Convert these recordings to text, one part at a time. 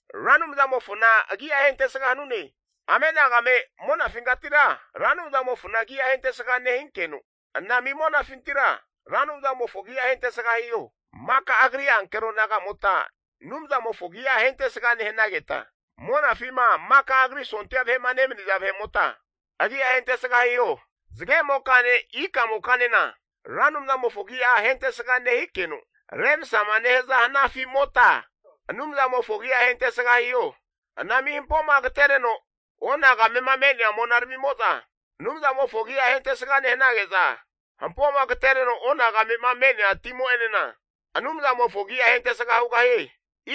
Ra Anumzamofona agi'a ahentesga hanune. Amenagame monafinkatira Ra Anumzamofona agi'a ahentesga nehinkeno, anami monafintira, Ra Anumzamofo agi'a ahentesga hiho. Maka Agri ankero nagamota Anumzamofo agi'a ahentesga nehanageta, monafima maka Agri sondia vahe'ma nemaniza vahe'mota agi'a ahentesga hiho. Zagemokane ikamokanena Ra Anumzamofo agi'a ahentesga nehikeno, remsama nehaza hanafi'mota Anumzamofo agi'a ahentesga hiho. Anami hampoma agatereno onagame'ma me'nea monaramimo'za Anumzamofo agi'a ahentesga nehanage'za, hampoma agatereno onagame'ma me'nea timo'enena Anumzamofo agi'a ahentesga hugahie.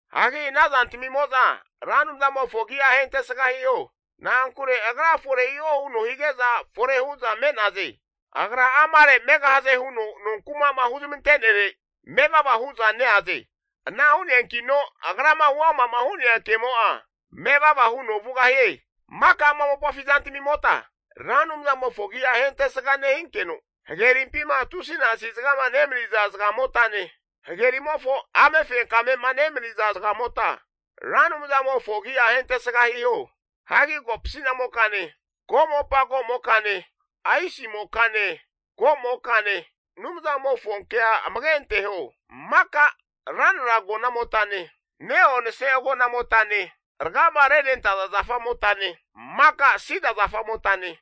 Hagi ana zantamimo'za Ra Anumzamofo agi'a ahentesga hiho. Na'ankure agra fore hiho huno hige'za fore hu'za me'naze. Agra amare megahaze huno nonkuma'ma huzmantenere manevava hu'za neaze. Ana hu'neankino agrama huama'ma hu'nea kemo'a, mevava huno vugahie. Maka ama mopafi zantamimota Ra Anumzamofo agi'a ahentesga nehinkeno, hagerimpima tusinasi zagama nemaniza zagamotane, hagerimofo amefenkamema nemaniza zagamota Ra Anumzamofo agi'a ahentesga hiho. Hagi kopasi'namokane komopa ko'mokane, aisimokane ko'mokane, Anumzamofonkea amage anteho. Maka ranra agona'motane, ne'onse agona'motane, rgama renentaza zafamotane, maka sida zafa'motane,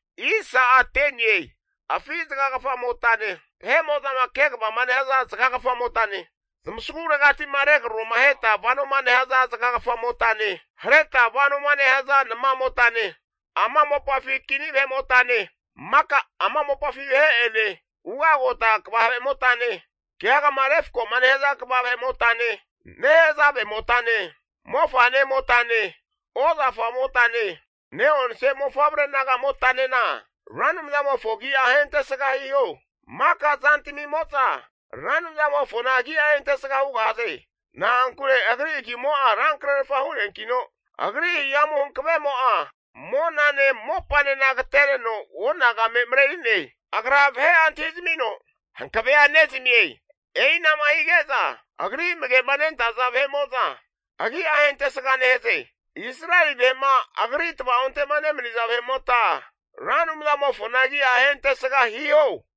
afi zagagafamotane, vahe'mo'zama kegava nehaza zagagafamotane, tamasagu regati'ma regraromaheta vanoma nehaza zaga kafamotane, hareta vanoma nehaza nama'motane, ama mopafi kini vahetamine, maka ama mopafi vahe'ene, ugagota kva vahe'motane, keagama refkoma nehaza kva vahe'motane, nehazave'motane mofa'nemotane, ozafamotane, ne'onse mofavre nagamotanena Ra Anumzamofo agi'a ahentesga hiho. Maka zantamimo'za Ra Anumzamofona agi'a ahentesga hugahaze. Na'ankure agri agimo'a rankrerfa hu'neankino, agri hihamu hankavemo'a monane mopanena agatereno onagame mareri'ne. Agra vahe'a antahizamino hankavea nezamie. E'inama hige'za agri amage'ma nentaza vahe'mo'za agi'a ahentesga nehaze. Israeli vahe'ma agri tvaonte'ma nemani'naza vahe'mota, Ra Anumzamofona agi'a ahentesga hiho.